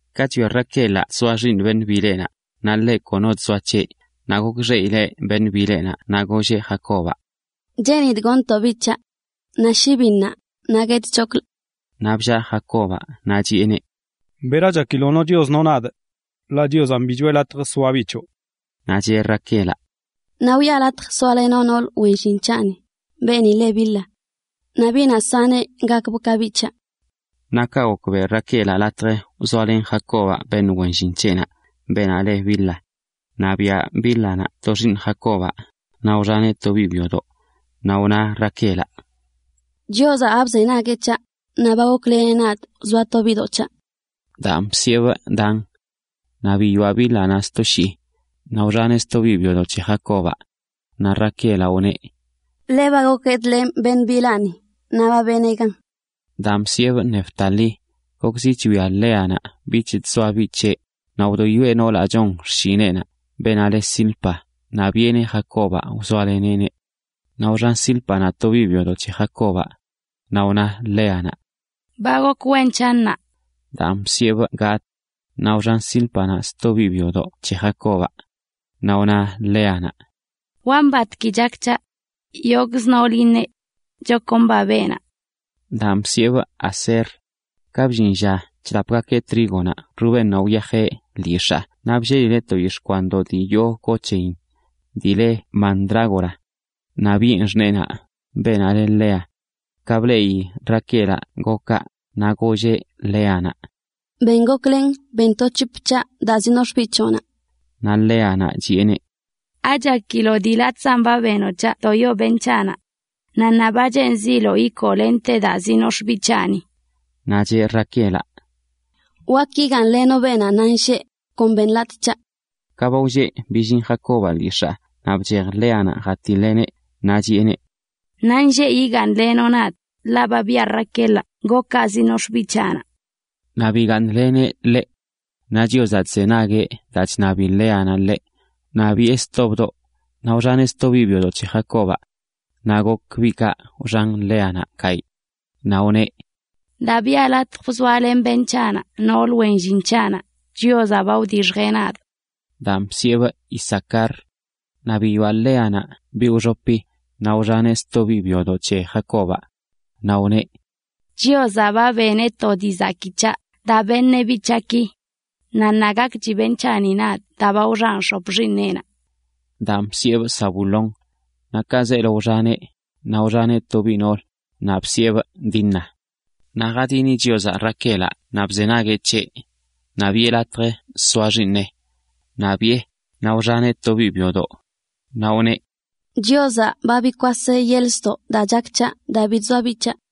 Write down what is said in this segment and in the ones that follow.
Ka chwia Raquelaꞌ chzoa xiiṉ beṉꞌ bileꞌnaꞌ, naꞌ ḻeꞌ kono chzoa c̱heꞌ, naꞌ gokxeꞌileꞌ beṉꞌ bileꞌnaꞌ. Naꞌ golleꞌ Jacobaꞌ: ―Cheenidꞌ goṉtoꞌ biꞌ c̱haꞌ. ¡Naꞌ shi bi ṉaa, naꞌ guetchoklꞌ! Naꞌ bllaa Jacobaꞌ naꞌ chiꞌeneꞌ: ―¿Bera chakiloꞌ no Chios no nadꞌ? Ḻaꞌ Chiozanꞌ bi choꞌe latj soa biꞌ choꞌ. Naꞌ cheꞌ Raquelaꞌ: ―Naꞌ wiꞌa latj soalenoꞌ noolə wen llin c̱haꞌni, beeni leꞌ Bilha. Naꞌ biꞌnaꞌ saneꞌ gakbꞌ ka biꞌ c̱haꞌ. Naꞌ kaꞌ gok, beꞌ Raquelaꞌ latj wzoalen Jacobaꞌ beṉꞌ wen llin c̱heꞌnaꞌ, beenaꞌ le Bilha. Naꞌ biaꞌ Bílhanaꞌ to xiiṉ Jacobaꞌ, naꞌ wxaneꞌ to biꞌ byodoꞌ. Naꞌ wna Raquelaꞌ: “Chiozaꞌ ba bzenagueꞌ c̱haꞌ, naꞌ ba gokleneꞌ nadꞌ wzoa to biꞌdoꞌ c̱haꞌ.” Daan bsiꞌebꞌ Dan. Naꞌ biyoaꞌ Bílhanaꞌ sto shii, naꞌ wxaneꞌ sto biꞌ byodoꞌ c̱he Jacobaꞌ. Naꞌ Raquelaꞌ wneꞌ: “Ḻe ba gokguedlenꞌ beṉꞌ bilaa, naꞌ ba benee gan.” Daan bsiꞌebꞌ Neftalí. Gokzi chwia Léanaꞌ bich chzoa biꞌ c̱heꞌ, naꞌ wdoyoeꞌ noolaꞌ chon xshineꞌnaꞌ, beenaꞌ le Zilpa, naꞌ biꞌeneꞌ Jacobaꞌ wzoaleneꞌneꞌ. Naꞌ wxan Zílpanaꞌ to biꞌ byodoꞌ c̱he Jacobaꞌ. Naꞌ wna Léanaꞌ: “Ba gok wen c̱haꞌ ṉaa.” Daan bsiꞌebꞌ Gad. Naꞌ wxan Zílpanaꞌ sto biꞌ byodoꞌ c̱he Jacobaꞌ. Naꞌ wna Léanaꞌ: “Wa mbatgui chak c̱haꞌ. Yogꞌzə noolə iṉeꞌ: Chakomba beenaꞌ.” Daan bsiꞌebꞌ Aser. Ka bllin lla chlapgakeꞌ trígonaꞌ Rubénnaꞌ wyajeꞌ lyix̱aa naꞌ bllelileꞌ to yix̱ꞌ kwandoꞌ dii yoo go c̱heyin, dii le mandrágora. a Naꞌ biꞌen xṉeenaꞌ, beenaꞌ le Lea. Ka bleꞌi Raquelaꞌ gokaꞌ, naꞌ golleꞌ Léanaꞌ: ―Ben goklen ben to c̱hop c̱haꞌ daa zinox̱ꞌ biꞌ c̱hoꞌnaꞌ. Naꞌ Léanaꞌ chiꞌeneꞌ: ―¿Achakiloꞌ dii latꞌzan benoꞌ c̱haꞌ wdoyo beṉꞌ c̱haꞌnaꞌ? Naꞌ ṉaa ba cheenziloꞌ ikoo lente daa zinox̱ꞌ biꞌ c̱haꞌni. Naꞌ cheꞌ Raquelaꞌ: ―Wakə igaaṉlenoꞌ beenaꞌ ṉaanlleꞌ, kon beṉ latꞌ c̱haꞌ. Ka ba wlleꞌ billin Jacobaꞌ lyix̱aa, naꞌ bchej Léanaꞌ jatiḻeꞌneꞌ, naꞌ chiꞌeneꞌ: ―Ṉaanlleꞌ yigaaṉlenoꞌ nadꞌ, ḻaꞌ ba biꞌa Raquelaꞌ gokaꞌ zinox̱ꞌ biꞌ c̱haꞌnaꞌ. Naꞌ bigaaṉleneꞌneꞌ. Naꞌ Chiozaꞌ chzenagueꞌ daa chṉabi Léanaꞌ ḻeꞌ, naꞌ biyoꞌe sto, naꞌ wxaneꞌ sto biꞌ byodoꞌ c̱he Jacobaꞌ. Naꞌ gok biꞌkaꞌ wxan Léanaꞌ gayꞌ. Naꞌ wneꞌ: “Daa biꞌa latj wzoalen beṉꞌ c̱haꞌnaꞌ noolə wen llin c̱haꞌnaꞌ, Chiozaꞌ ba wdixjeꞌ nadꞌ.” Daan bsiꞌebꞌ Isacar. Naꞌ biyoꞌa Léanaꞌ biꞌ wxopi, naꞌ wxaneꞌ sto biꞌ byodoꞌ c̱he Jacobaꞌ. Naꞌ wneꞌ: “Chiozaꞌ ba beneꞌ to dii zakii c̱haꞌ daa beṉeꞌ biꞌ c̱haꞌki. Naꞌ ṉaa gakchi beṉꞌ c̱haꞌnaꞌ nadꞌ daa ba wxanꞌ x̱op xiiṉeꞌnaꞌ.” Daan bsiꞌebꞌ Zabulón. Naꞌ ka zeelo wxaneꞌ, naꞌ wxaneꞌ to biꞌ noolə, naꞌ bsiꞌebꞌ Dina. Naꞌ jadini Chiozaꞌ Raquelaꞌ naꞌ bzenagueꞌ c̱heꞌ, naꞌ biꞌe latj soa xiiṉeꞌ. Naꞌ biꞌe, naꞌ wxaneꞌ to biꞌ byodoꞌ. Naꞌ wneꞌ: “Chiozaꞌ ba bikwaseꞌ yeḻꞌ ztoꞌ daa chak c̱haꞌ daa bi chzoa biꞌ c̱haꞌ.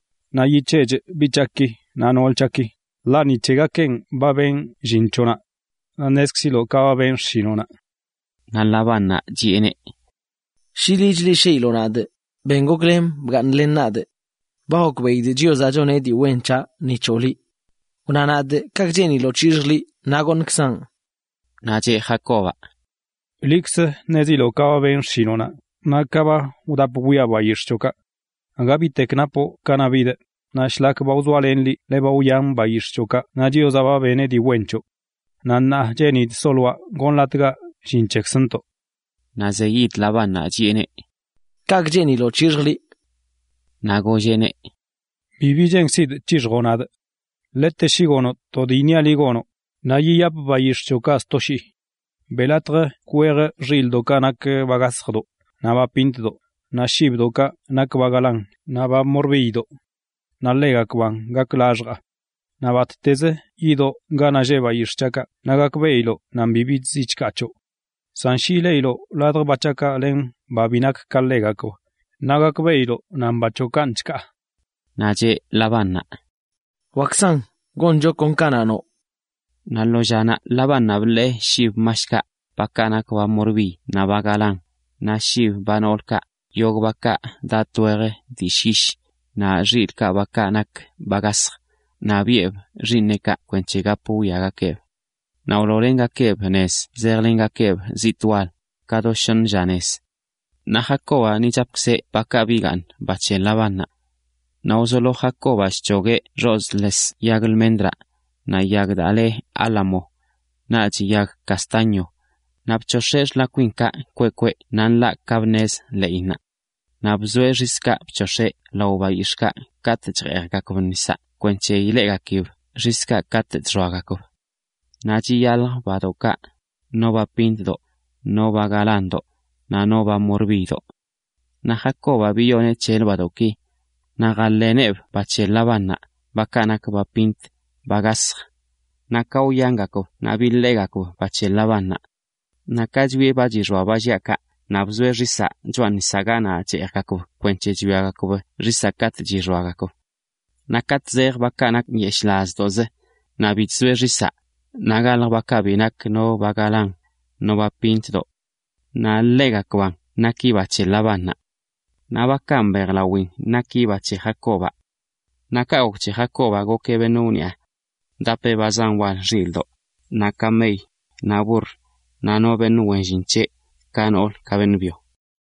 Naꞌ yic̱heꞌchꞌ biꞌ c̱haꞌki naꞌ nool c̱haꞌki, ḻaꞌ ni c̱hegakeꞌn ba benꞌ llin c̱hoꞌnaꞌ naꞌ ṉezkziloꞌ ka ba benꞌ xshinoꞌnaꞌ. Naꞌ Labánnaꞌ chiꞌeneꞌ: ―Shi liꞌ chleꞌshiiloꞌ nadꞌ, ben goklen bgaaṉlen nadꞌ. Ba gokbeꞌidꞌ Chiozaꞌ choneꞌ dii wen c̱haꞌ ni c̱hoꞌ liꞌ. Wna nadꞌ kaꞌkꞌ cheeniloꞌ c̱hixjꞌ liꞌ naꞌ goṉkzaꞌn. Naꞌ cheꞌ Jacobaꞌ: ―Liꞌkz ṉeziloꞌ ka ba benꞌ xshinoꞌnaꞌ naꞌ ka ba wdap bwiaꞌ bayix̱ꞌ c̱hoꞌkaꞌ. Aga bitek napoꞌ kanaꞌ bidꞌ, naꞌ shlak ba wzoalenꞌ liꞌ ḻe ba wyan bayix̱ꞌ c̱hoꞌkaꞌ naꞌ Chiozaꞌ ba beneꞌ dii wen c̱hoꞌ. Naꞌ ṉaa cheenidꞌ soloaꞌ gonlatgaꞌ llin c̱hekzntoꞌ. Naꞌ zeyid Labánnaꞌ chiꞌeneꞌ: ―¿Kaꞌkꞌ cheeniloꞌ c̱hixjꞌ liꞌ? Naꞌ golleꞌneꞌ: ―Bibi cheenkzidꞌ c̱hixjoꞌ nadꞌ. Ḻete shi gonoꞌ to dii iṉiaꞌ liꞌ, naꞌ yiyapꞌ bayix̱ꞌ c̱hoꞌkaꞌ sto shii. Beꞌ latj kwejꞌ xilꞌdoꞌkaꞌ nak ba gasjdoꞌ, naꞌ ba pintodoꞌ, naꞌ shibdoꞌkaꞌ nak ba galán naꞌ ba morbiydoꞌ. Ḻegakb gakgakb laxjaa. Naꞌ battezə yidoꞌ ganaꞌ lleꞌ bayix̱ꞌ c̱haꞌkaꞌ naꞌ gakbeꞌiloꞌ nan bibi chziꞌ chkaa c̱hoꞌ. San shi ileꞌiloꞌ ladj ba c̱haꞌkaꞌ len ba bi nak ka ḻegakb, naꞌ gakbeꞌiloꞌ nan ba c̱hoꞌ kanꞌ chkaa. Naꞌ cheꞌ Labánnaꞌ: ―Wakzan, goncho kon ka noꞌ. Naꞌ lo llanaꞌ Labánnaꞌ biḻee shib mashkaꞌ, bakaꞌ nak ba morbiy naꞌ ba galán, naꞌ shib ba noolkaꞌ, yogꞌ bakaꞌ daꞌ latꞌ wej dii llyish, naꞌ xilꞌkaꞌ, bakaꞌ nak ba gasj, naꞌ biꞌeb xiiṉeꞌkaꞌ kwenc̱he gap wwiagakeeb. Naꞌ wloolengakeꞌb nez zejlengakeꞌb zitꞌ wal, ka do shoṉ lla nez. Naꞌ Jacobaꞌ ni chapkzeꞌ bakaꞌ bigaaṉ, ba c̱he Labánnaꞌ. Naꞌ wzolo Jacobaꞌ chc̱hogueꞌ xozꞌ les yag lmendraꞌ, naꞌ yag daa le álamo, naꞌch yag castaño, naꞌ bc̱hox̱eꞌ xlakwinkaꞌ kweꞌ kweꞌ naꞌ nḻaꞌ ka bnezə ḻeꞌinnaꞌ. Naꞌ bzoeꞌ xiskaꞌ bc̱hox̱eꞌ lao bayix̱ꞌkaꞌ katꞌ chjeejgakb nisaꞌ kwenc̱he ileꞌgakib xiskaꞌ katꞌ chxoagakb. Naꞌ chiyalj badoꞌkaꞌ, no ba pintdoꞌ, no ba galándoꞌ, naꞌ no ba morbiydoꞌ. Naꞌ Jacobaꞌ biyoneꞌ c̱helə badoꞌki, naꞌ jaḻeeneꞌb ba c̱he Labánnaꞌ, bakaꞌ nak ba pint, ba gasj, naꞌ ka wyangakb naꞌ biḻeegakb ba c̱he Labánnaꞌ. Naꞌ ka chwieꞌ ba chixoa ba lliꞌa kaꞌ, naꞌ bzoeꞌ xisaꞌ choꞌa nisaꞌ ganaꞌ cheejgakb kwenc̱he chwiagakb xisaꞌ katꞌ chixoagakb. Naꞌ katꞌ zejə bakaꞌ nak nyeshꞌlazdoꞌzə, naꞌ bi chzoeꞌ xisaꞌ, naꞌ galjə bakaꞌ bi nak no ba galán, no ba pintdoꞌ. Naꞌ ḻegakbaꞌn naki ba c̱he Labánnaꞌ. Naꞌ bakaꞌ mbejlawin naki ba c̱he Jacobaꞌ. Naꞌ kaꞌ gok c̱he Jacobaꞌ gokeꞌ beṉꞌ wniꞌa. Wdapeꞌ ba zan wal xilꞌdoꞌ, naꞌ kamey, naꞌ burr, naꞌ no beṉꞌ wen llin c̱heꞌ, ka noolə ka beṉꞌ byo.